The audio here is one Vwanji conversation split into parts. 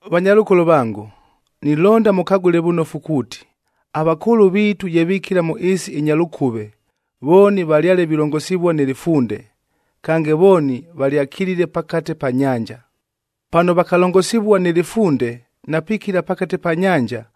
Vanyalʉkolo vango, nilonda mʉkagʉle vʉnofu kuuti, avakʉʉlʉ viitu ye vikila mʉ ɨɨsi ɨnya lʉkʉve, vooni valyale vilongosivua nɨ lɨfunde,a kange vooni valyakilile pakate pa nyanja. Pano vakalongosivua nɨ lɨfunde na pikila pakate pa nyanja,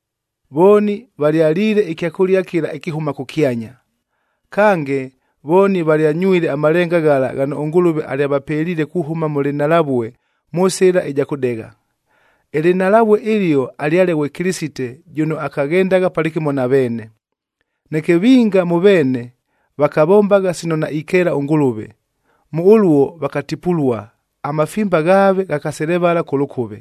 Vooni valyaliile ɨkyakʉlia kɨla ɨkɨhʉma kʉkyanya.c Kange, vooni valyanywile amalenga ghala ghano ʉNgʉlʉve alyavapeliile kuhʉma mʉ lɨnhalavue mʉ sɨla ɨja kʉdegha.d Ɨlɨnhalavue ɨlio alyale ghwe Kɨlɨsite jʉno akaghendagha palɨkɨmo na veene. Neke vinga mʉ veene, vakavombagha sino naikeela ʉNgʉlʉve, mʉ ʉluo vakatipulua, amafimba ghaave ghakaselevala kʉ lʉkʉve.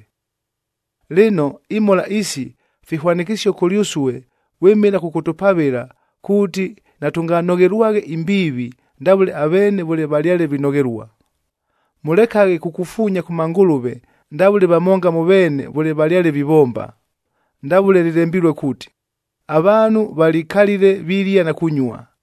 Lɨno imhola isi, fihwanɨkɨsio kʉlyʉsue vwɨmɨla kʉkʉtʉpavɨla, kuuti natʉnganoghelwaghe imbiivi ndavʉle aveene vʉle valyale vinoghelua. Mʉlekaghe kukufuunya kʉ mangʉlʉve ndavʉle vamonga mʉ veene vʉle valyale vivomba, ndavʉle lɨlembilue kuuti, “Avaanhu valikalile vilia na kunyua,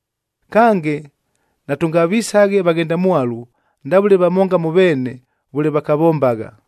Kange, natʉngavisaghe vaghendamwalu ndavʉle vamonga mʉ veene vʉle vakavombagha,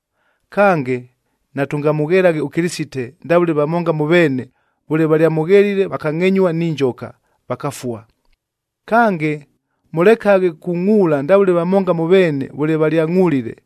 Kange, natʉngamʉghelaghe ʉKɨlɨsite ndavʉle vamonga mʉ veene vʉle valyamughelile, vakangʼenyua ni njoka, Kange, mʉlekaghe kungʼuula ndavʉle vamonga mʉ veene vʉle valyangʼulile,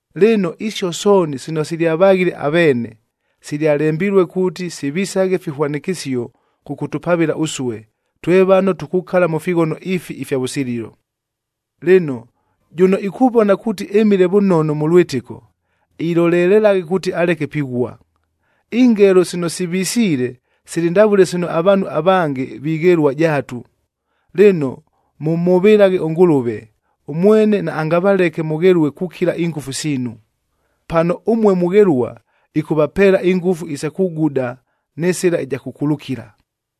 Lɨno, isio sooni sino silyavaghile aveene, silyalembilue kuuti sivisaghe fihwanɨkɨsio kʉkʉtʉpavɨla ʉsue, twe vano tukukala mʉ fighono ifi ifya vʉsililo. Lɨno, jʉno ikuvona kuuti ɨmile vʉnono mʉ lwɨtɨko, ilolelelaghe kuuti aleke pighua. Ingelo sino sivisiile, sili ndavʉle sino avaanhu avange vighelua jaatu. Lɨno, mʉmhʉvɨlaghe ʉNgʉlʉve, ʉmwene naangavaleke mʉghelue kukila ingʉfu siinu. Pano ʉmue mughelua, ɨkʉvapeela ingʉfu isa kuguda nɨ sɨla ɨja kʉkulukila.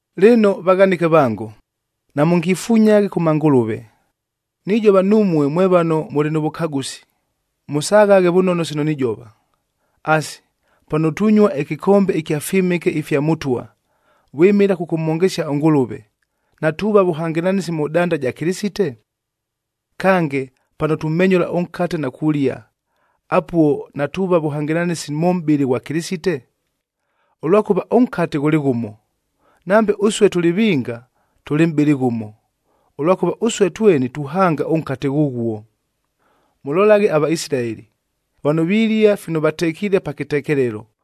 Lɨno vaghanɨke vango, namʉngifunyaghe kʉ mangʉlʉve! Nijova numue mwe vano mʉlɨ nʉ vʉkagʉsi, mʉsaghaghe vʉnono sino nijova. Asi, pano tunyua ɨkɨkombe ɨkya fyɨmɨke ifya Mʉtwa, vwɨmɨla kʉkʉmhongesia ʉNgʉlʉve, natuuva vʉhangɨlanɨsi mʉ danda ja Kɨlɨsite? Kange, pano tumenyʉla ʉnkate na kulia, apuo natuuva vʉhangɨlanɨsi mʉ mʼbɨlɨ ghwa Kɨlɨsite? Ʉlwakʉva ʉnkate ghʉlɨ ghʉmo, nambe ʉsue tʉlɨ vinga, tʉlɨ mʼbɨlɨ ghʉmo, ʉlwakʉva ʉsue tweni tuhanga ʉnkate ghʉghuo. Mʉlolaghe aVaisilaeli, vano vilia fino vatekiile pa kɨtekelelo,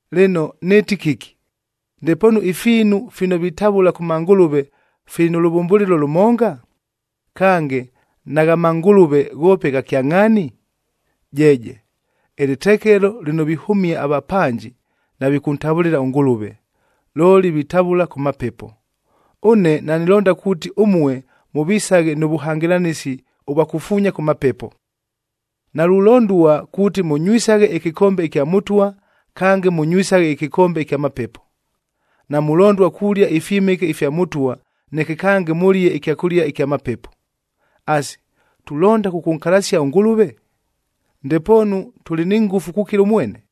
Lɨno nɨɨti kɨki? Ndepoonu ifiinu fino vitavʉla kʉ mangʉlʉve fili nʉ lʉvʉmbʉlɨlo lʉmonga? Kange, nagha mangʉlʉve ghoope gha kyangʼhaani? Jeeje! Ɨlɨtekelo lɨno vihʉmia avapanji, navikʉntavʉlɨla ʉNgʉlʉve, looli vitavʉla kʉ mapepo. Ʉne nanilonda kuuti ʉmue mʉvisaghe nʉ vʉhangɨlanɨsi ʉvwa kufuunya kʉ mapepo. Nalulondua kuuti mʉnywisaghe ɨkɨkombe ɨkya Mʉtwa, kange mʉnywisaghe ɨkɨkombe ɨkya mapepo; namulondua kulia ifyɨmɨke ifya Mʉtwa, neke kange mʉlie ɨkyakʉlia ɨkya mapepo. Asi, tulonda kʉkʉnkalasia ʉNgʉlʉve? Ndepoonu tʉlɨ ni ngʉfu kukila ʉmwene?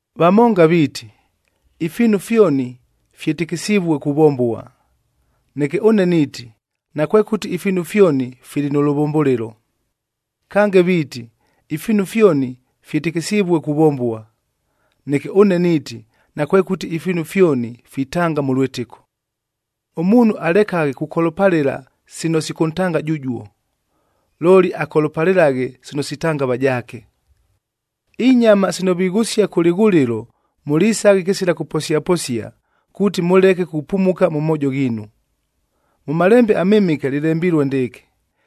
Vamonga viiti, “Ifiinu fyoni fyɨtɨkɨsivue kuvombua.” Neke ʉne niiti nakwekʉti ifiinu fyoni fili nʉ lʉvʉmbʉlɨlo. Kange viiti, “Ifiinu fyoni fyɨtɨkɨsivue kuvombua.” Neke ʉne niiti nakwekʉti ifiinu fyoni fitanga mʉ lwɨtɨko. Ʉmuunhu alekaghe kukolopalɨla sino sikʉntanga jʉjuo, looli akolopalɨlaghe sino sitanga avajaake. Inyama sino vighʉsia kʉ lɨghʉlɨlo mʉlisaghe kɨsila kʉposiaposia, kuuti mʉleke kupumuka mʉ moojo ghiinu. Mʉ Malembe aMɨmɨke lɨlembilue ndɨɨkɨ,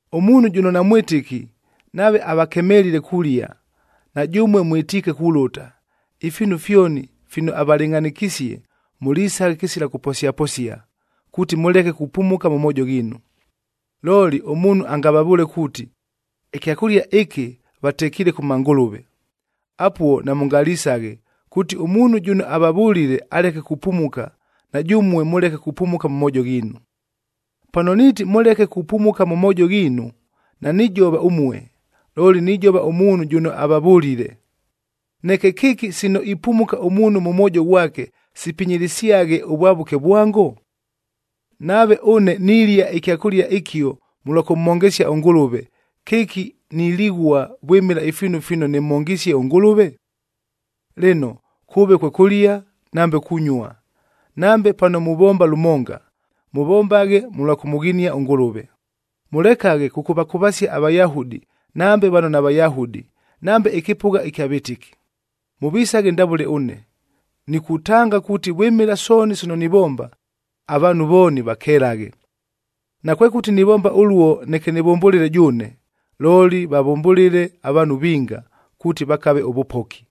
Ʉmuunhu jʉno namwɨtɨki nave avakemelile kulia, na jʉmue mwɨtiike kulʉta, ifiinu fyoni fino avalɨngʼhanɨkisie, mʉlisaghe kɨsila kʉposiaposia, kuuti mʉleke kupumuka mʉ moojo ghiinu. Looli ʉmuunhu angavavʉʉle kuuti, “Ɨkyakʉlia ɨkɨ vatekiile kʉ mangʉlʉve,” apuo namʉngalisaghe kuuti ʉmuunhu jʉno avavʉlile aleke kupumuka, na jʉmue mʉleke kupumuka mʉ moojo ghiinu. Pano niiti, “Mʉleke kupumuka mʉ moojo ghiinu,” nanijova ʉmue, looli nijova ʉmuunhu jʉno avavʉlile. Neke kɨki sino ipumuka ʉmuunhu mʉ mwojo ghwake, sipinyilisyaghe ʉvwavʉke vwango? Nave ʉne nilia ɨkyakʉlia ɨkio mʉlwa kʉmhongesia ʉNgʉlʉve, kɨki nilighua vwɨmɨla ifiinu fino nɨmhongisie ʉNgʉlʉve? Lɨno, kʉʉve kwe kʉlia, nambe kunyua, nambe pano muvomba lʉmonga, mʉvombaghe mʉlwa kʉmʉghinia ʉNgʉlʉve. Mʉlekaghe kʉkʉvakʉvasia aVayahudi nambe vano naVayahudi nambe ɨkɨpʉgha ɨkya vɨtɨki. Mʉvisaghe ndavʉle ʉne, nikutanga kuuti vwɨmɨla sooni sino nivomba, avaanhu vooni vakelaghe. Nakwekʉti nivomba ʉluo neke nɨvʉmbʉlɨle jʉʉne, looli vavʉmbʉlɨle avaanhu vinga, kuuti vakave ʉvʉpoki.